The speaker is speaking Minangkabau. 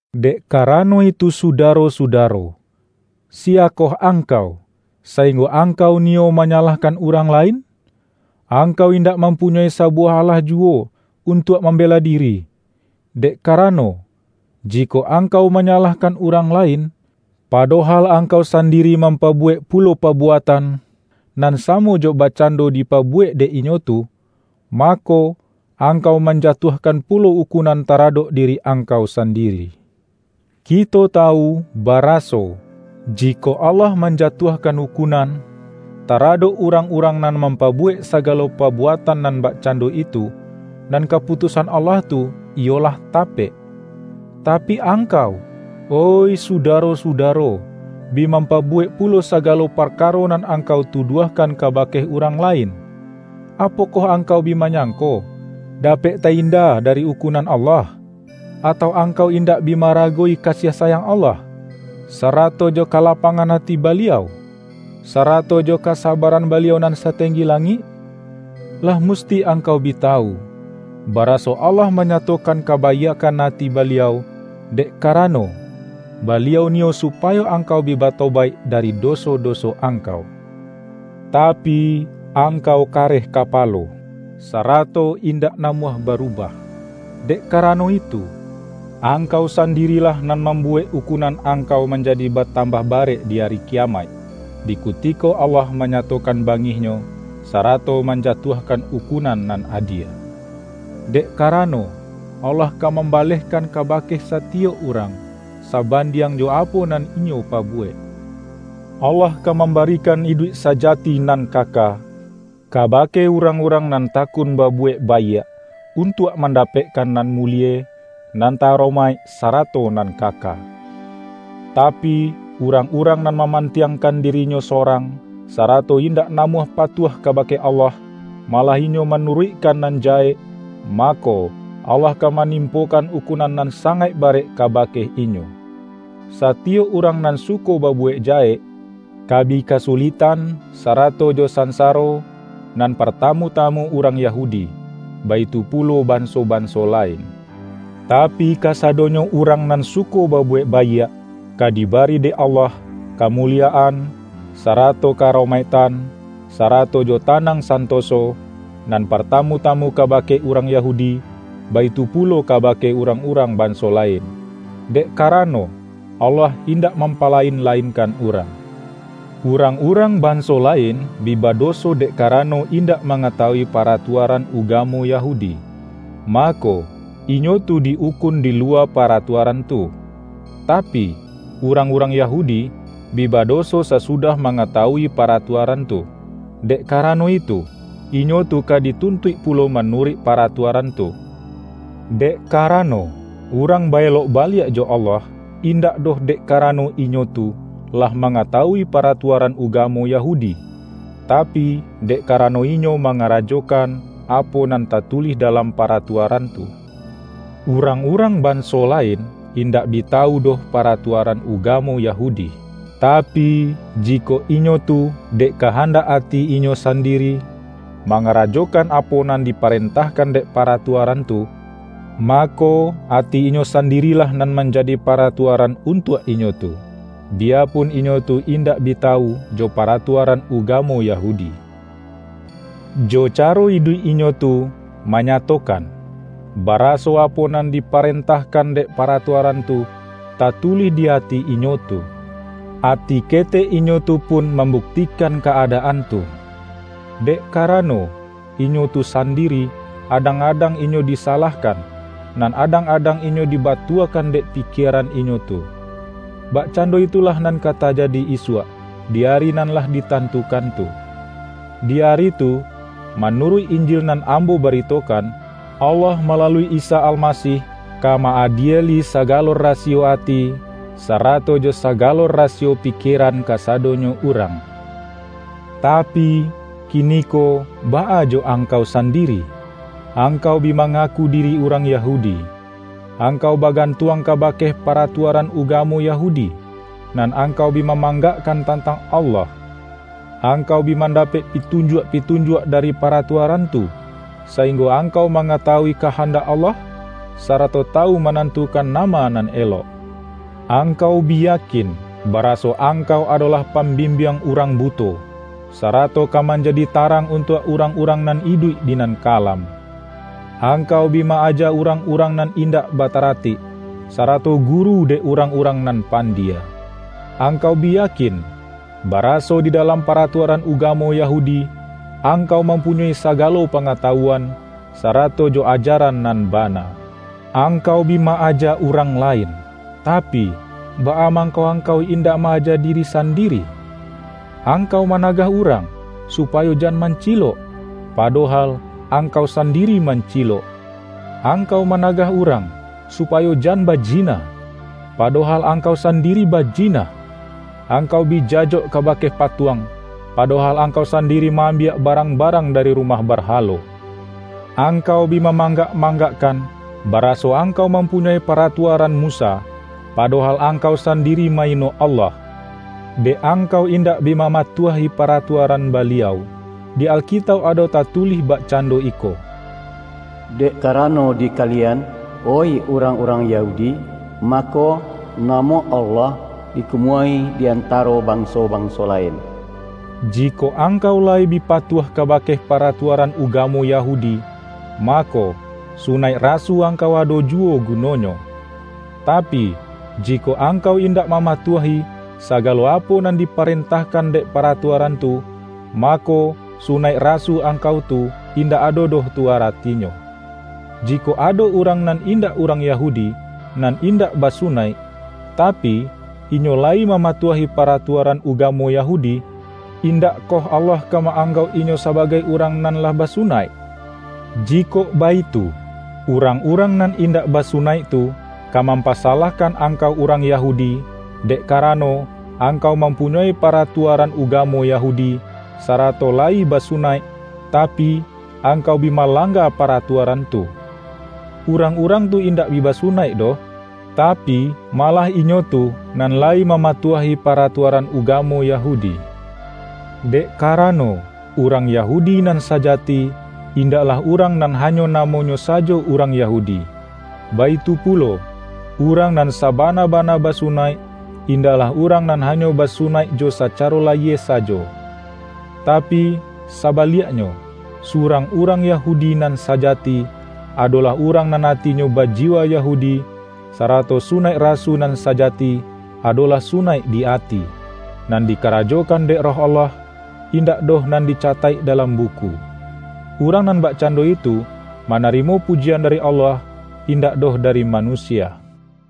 Dek karano itu sudaro-sudaro, siya koh angkau, sainggo angkau niyo manyalahkan urang lain? Angkau indak mampunyoi sabuwah alah juwo untuak mambela diri! Dek karano, jikok angkau manyalahkan urang lain, padohal angkau sandiri mampabuwek pulo pabuatan, nan samo jo bakcando dipabuwek dek inyo tu, mako, angkau manjatuahkan pulo ukunan taradok diri angkau sandiri. Kito tawu, baraso, jikok Allah manjatuahkan ukunan, taradok urang-urang nan mampabuwek sagalo pabuatan nan bakcando itu, nan kaputusan Allah tu, iyo lah tapek. Tapi angkau, oih sudaro-sudaro, bi mampabuwek pulo sagalo parkaro nan angkau tuduahkan kabake urang lain! Apokoh angkau bi manyangko, dapek ta-inda dari ukunan Allah? Atau angkau indak bi ma-aragowi kasiah sayang Allah, sarato jo kalapangan ati Baliau, sarato jo kasabaran Baliau nan satenggi langik? Lah musti angkau bi tawu, baraso Allah manyatokan kabaiakkan ati Baliau, dek karano, Baliau niyo supayo angkau bi batobaik dari doso-doso angkau. Tapi, angkau kareh kapalo, sarato indak namuah barubah. Dek karano itu, angkau sandirilah nan mambuwek ukunan angkau manjadi batambah barek di Ari Kiyamaik, di kutiko Allah manyatokan bangih-Nyo, sarato manjatuahkan ukunan nan adie. Dek karano, Allah ka mambalehkan kabake satiyok urang, sabandiang jo apo nan inyo pabuwek. Allah ka mambarikan iduik sajati nan kaka, kabake urang-urang nan takun babuwek baiak, untuak mandapekkan nan mulie, nan ta-aromaik sarato nan kaka. Tapi, urang-urang nan mamantiangkan dirinyo sorang, sarato indak namuah patuah kabake Allah, malah inyo manuruikkan nan jahek, mako, Allah ka manimpokan ukunan nan sangaik barek kabake inyo. Satiyok urang nan suko babuwek jahek, ka bi kasuliktan, sarato jo sansaro; nan partamu-tamu urang Yahudi, baitu pulo banso-banso lain. Tapi, kasadonyo urang nan suko babuwek baiak, ka dibari dek Allah, kamuliyaan, sarato ka-aromaiktan, sarato jo tanang santoso; nan partamu-tamu kabake urang Yahudi, baitu pulo kabake urang-urang banso lain. Dek karano, Allah indak mampalain-lainkan urang. Urang-urang banso lain, bi badoso dek karano indak mangatawui paratuaran ugamo Yahudi. Mako, inyo tu di-ukun di luwa paratuaran tu. Tapi, urang-urang Yahudi, bi badoso sasudah mangatawui paratuaran tu; dek karano itu, inyo tu ka dituntuik pulo manuruik paratuaran tu. Dek karano, urang ba-elok baliak jo Allah, indak doh dek karano inyo tu, lah mangatawui paratuaran ugamo Yahudi, tapi, dek karano inyo mangarajokan, apo nan tatulih dalam paratuaran tu. Urang-urang banso lain, indak bi tawu doh paratuaran ugamo Yahudi. Tapi, jikok inyo tu, dek kahandak ati inyo sandiri, mangarajokan apo nan diparentahkan dek paratuaran tu, mako, ati inyo sandirilah nan manjadi paratuaran untuak inyo tu, biyapun inyo tu indak bi tawu jo paratuaran ugamo Yahudi. Jo caro iduik inyo tu, manyatokan, baraso apo nan diparentahkan dek paratuaran tu, tatulih di ati inyo tu. Ati ketek inyo tu pun mambuktikan ka-adaan tu, dek karano, inyo tu sandiri, adang-adang inyo disalahkan, nan adang-adang inyo dibatuakan dek pikieran inyo tu. Bakcando itulah nan ka tajadi isuak, di ari nan lah ditantukan tu. Di ari tu - manuruik Injil nan ambo baritokan - Allah malalui Isa Almasih, ka ma-adieli sagalo rasiyo ati, sarato jo sagalo rasiyo pikieran kasadonyo urang. Tapi, kiniko baa jo angkau sandiri? Angkau bi mangaku diri urang Yahudi. Angkau bagantuang kabake paratuaran ugamo Yahudi, nan angkau bi mamanggakkan tantang Allah. Angkau bi mandapek pitunjuak-pitunjuak dari paratuaran tu, sainggo angkau mangatawui kahandak Allah, sarato tawu manantukan nama nan elok. Angkau bi yakin, baraso angkau adolah pambimbiang urang buto, sarato ka manjadi tarang untuak urang-urang nan iduik di nan kalam. Angkau bi ma-aja urang-urang nan indak bataratik, sarato guru dek urang-urang nan pandie. Angkau bi yakin, baraso di dalam paratuaran ugamo Yahudi, angkau mampunyoi sagalo pangatawuan, sarato jo ajaran nan bana. Angkau bi ma-aja urang lain; tapi, baa mangko angkau indak ma-aja diri sandiri? Angkau managah urang, supayo jan mancilok, padohal angkau sandiri mancilok! Angkau managah urang, supayo jan bajina, padohal angkau sandiri bajina! Angkau bi jajok kabake patuang, padohal angkau sandiri ma-ambiak barang-barang dari rumah barhalo. Angkau bi mamanggak-manggakkan, baraso angkau mampunyoi paratuaran Musa, padohal angkau sandiri ma-ino Allah, dek angkau indak bi mamatuahi paratuaran Baliau. Di Alkitauk ado tatulih bakcando iko, ”Dek karano di kalian, oih urang-urang Yahudi, mako, namo Allah dikumuahi di antaro banso-banso lain.” Jikok angkau layi bi patuah kabake paratuaran ugamo Yahudi, mako, sunaik rasu angkau ado juwo gunonyo. Tapi, jikok angkau indak mamatuahi, sagalo apo nan diparentahkan dek paratuaran tu, mako, sunaik rasu angkau tu, indak ado doh tu aratinyo. Jikok ado urang nan indak urang Yahudi, nan indak basunaik, tapi, inyo layi mamatuahi paratuaran ugamo Yahudi, indakkoh Allah ka ma-anggauk inyo sabagai urang nan lah basunaik? Jikok baitu, urang-urang nan indak basunaik tu, ka mampasalahkan angkau urang Yahudi, dek karano, angkau mampunyoi paratuaran ugamo Yahudi, sarato layi basunaik, tapi, angkau bi malangga paratuaran tu. Urang-urang tu indak bi basunaik doh, tapi, malah inyo tu, nan layi mamatuahi paratuaran ugamo Yahudi. Dek karano, urang Yahudi nan sajati, indaklah urang nan hanyo namonyo sajo urang Yahudi; baitu pulo, urang nan sabana-bana basunaik, indaklah urang nan hanyo basunaik jo sacaro layie sajo. Tapi, sabaliaknyo, surang urang Yahudi nan sajati, adolah urang nan atinyo bajiwa Yahudi; sarato sunaik rasu nan sajati, adolah sunaik di ati, nan dikarajokan dek Roh Allah, indak doh nan dicataik dalam buku. Urang nan bakcando itu, manarimo pujian dari Allah, indak doh dari manusia. ROMA